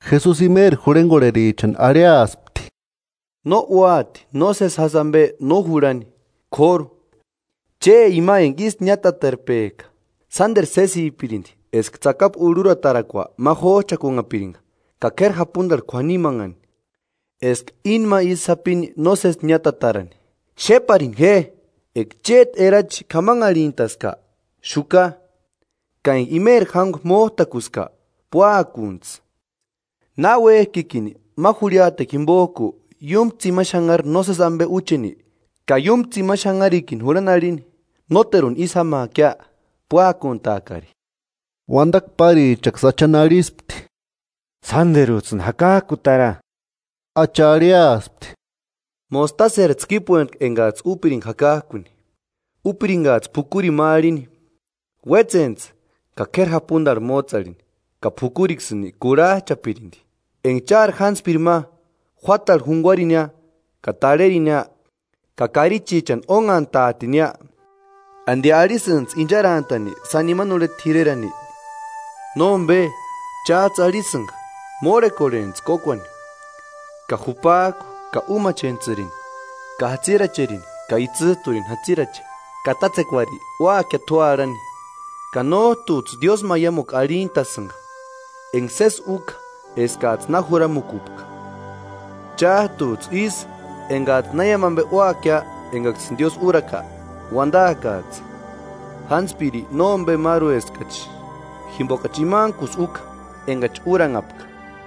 Jesusi imeri jurhengorherichani arhiaspti: “No úati nósesi jásï ambe no jurhani, k'óru ¡Che ima enga ísï niátatarpejka! Sánderu sésipirindi eska tsakapu urhuratarakua ma jójchakunhapiringa ka k'éri japundarhu k'uanimanhani, eska íni ma isï sapini nósesi niátatarani. ¡Xéparini je!” “Eka chéti erachi k'amanharhintaska, xuka; ka enga imeri jángua mójtakuska, púakuntsï. Na uéjkikini ma jurhiatekua jimbojku iúmu tsimani xanhari nósesi ambe úcheni, ka iúmu tsimani xanharikini jurhani arhini: ‘Nóteruni ísï jámaakia; púakuntaakari.’” Uandakua párichaksï Achani arhispti: –Sánderujtsïni jakajkutara. Acha arhiaspti: –Mostaseri tskípuentku engajtsï úpiringa jakajkuni, úpiringajtsï p'ukurini ma arhini: Uétsentsï ka k'éri japundarhu mótse arhini, ka p'ukuriksïni kurhajchapirindi. “Enga chári jántspirini ma, juátarhu junguarinia ka tarherinia ka karichichani ónhantaatinia, ¿Andi arhisïnijtsï incharantani sáni imani urheta t'irerani? Nómbe chájtsï arhisïnga: ‘Mórhekorhentsï kókuani ka jupajku ka úmachentsïrini, ka jatsiracherini ka itsïjturini jatsirache. Ka tátsekuari úakia t'u arhani.’ Ka nójtujtsï diósïmaiamukua arhintasïnga enga sési úka eskajtsï na juramukupka. Chájtujtsï ísï, engajtsï na iámu ambe úakia engaksïni Diósï úraka, uandaakajtsï: ‘Jántspiri nómbemarueskachi, jimbokachi imantkusï úka engachi úranhapka.’”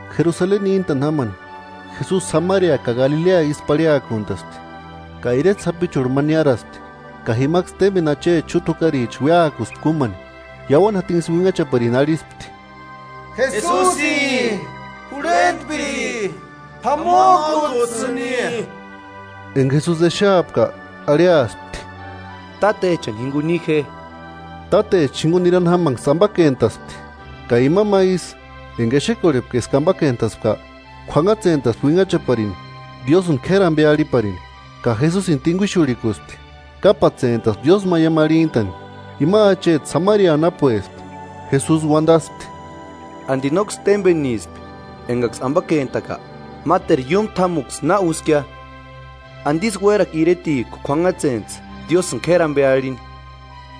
Jerusaleni níntani jámani, Jesusi Samaria ka Galilea ísï parhiakuntaspti. Ka ireta sapichurhu ma niáraspti, ka jimaksï témbeni acheti xúta jukaricha uéakuspti kúmani, iauani jatinksï uinhachaparini arhispti: –¡Jesusi, Jurhentpiri, p'amojkujtsïni! Enga Jesusi exeapka, arhiaspti: –Tátechani jinguni ni je. Tátecha jinguni nirani jámanksï ambakentaspti. Ka ima ma ísï enga exekorhepka eska ambakentaspka, k'uanhatsentaspti uinhachaparini Diósïni k'éri ambe arhiparini, ka Jesusini tinguixurhikuspti, kápatsentaspti diósïmaiamu arhintani. Ima acheti Samaria anapuespti. Jesusi uandaspti: –¿Andi nóksï témbenispki engaksï ambakentaka? ¿Máteru iúmu t'ámuksï na úskia? ¿Andisï uérakua iretijku k'uanhatsentsï Diósïni k'éri ambe arhini?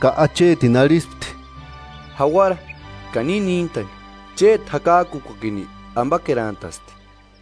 Ka achetini arhispti: –Jauara ka ni níntani chéti jakajkukuakini ambakerantasti.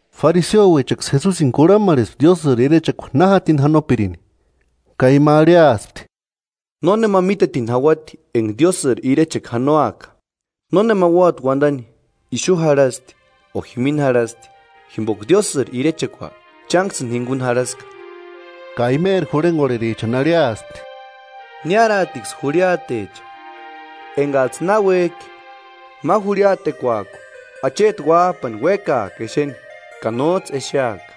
Fariseouechaksï Jesusini kurhamarhespti Diósïri irechekua na jatini janopirini, ka ima arhiaspti: –Nónema mítetini jauati enga Diósïri irechekua janoaka. Nónema úati uandani: Ixu jarhasti o jimini jarhasti; jimboka Diósïri irechekua chánksïni jinguni jarhaska. Ka imeri jurhengorherichani arhiaspti: –Niáraatiksï jurhiatecha engajtsï náuejki ma jurhiatekuajku acheti Uájpani uékaaka exeni, ka nójtsï exeaka.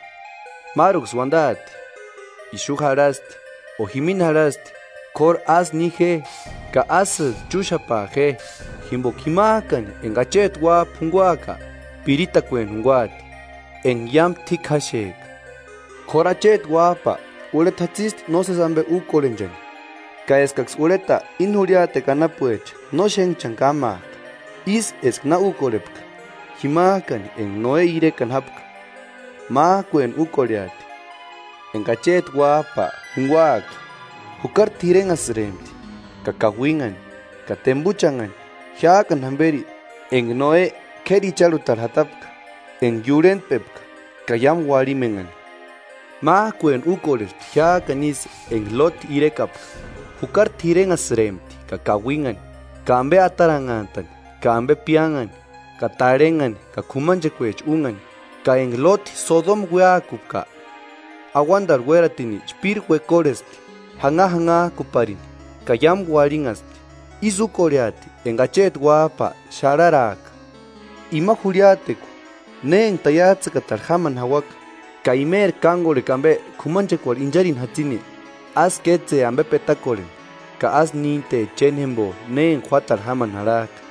Máruksï uandaati: Ixu jarhasti, o jimini jarhasti; kóru ásï ni je, ka ásïjtu chúxapaa je. Jimboka jimajkani enga acheti Uájpa junguaaka, piritakueni junguaati, enga iámu t'íkjaxejka, k'óru acheti Uájpa urheta jatsisti nósesi ambe úkorhenchani ka eskaksï urheta íni jurhiatekua anapuecha no xénhchani kámaaka. Ísï eska na úkorhepka jimajkani enga Noe irekani jápka, májkuentu úkorheati enga acheti Uájpa junguaaka. Jukari t'irenhasïrempti, ka kauinhani ka tembuchanhani jiájkani jamberi enga Noe k'éri icharhutarhu jatapka, enga iurhentpepka ka iámu uarhimenhani. Májkueni úkorhespti jiájkani ísï enga Lóti irekapka: Jukari t'irenhasïrempti ka kauinhani, ka ambe ataranhantani ka ambe piánhani ka tarhenhani ka k'umanchekuecha únhani; ka enga Lóti Sodoma uéakupka, auandarhu uératini chpíri uekorhespti janhajanhajkuparini ka iámu uarhinhaspti. Ísï úkorheati enga acheti Uájpa xarharaaka. “Ima jurhiatekua, ne enga taiajtsïtakatarhu jámani jauaka ka imeri kángorhekua ambe k'umanchekuarhu incharini jatsini, ásï kétse ambe petakorheni; ka ásï nínte chénjembo ne enga juátarhu jámani jarhajka.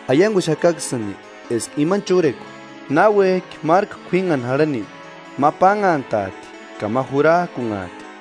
Aianguxakaksïni eska imani chúrekua, náuejki márku k'uínhani jarhani ma pánhantaati ka ma jurajkunhaati.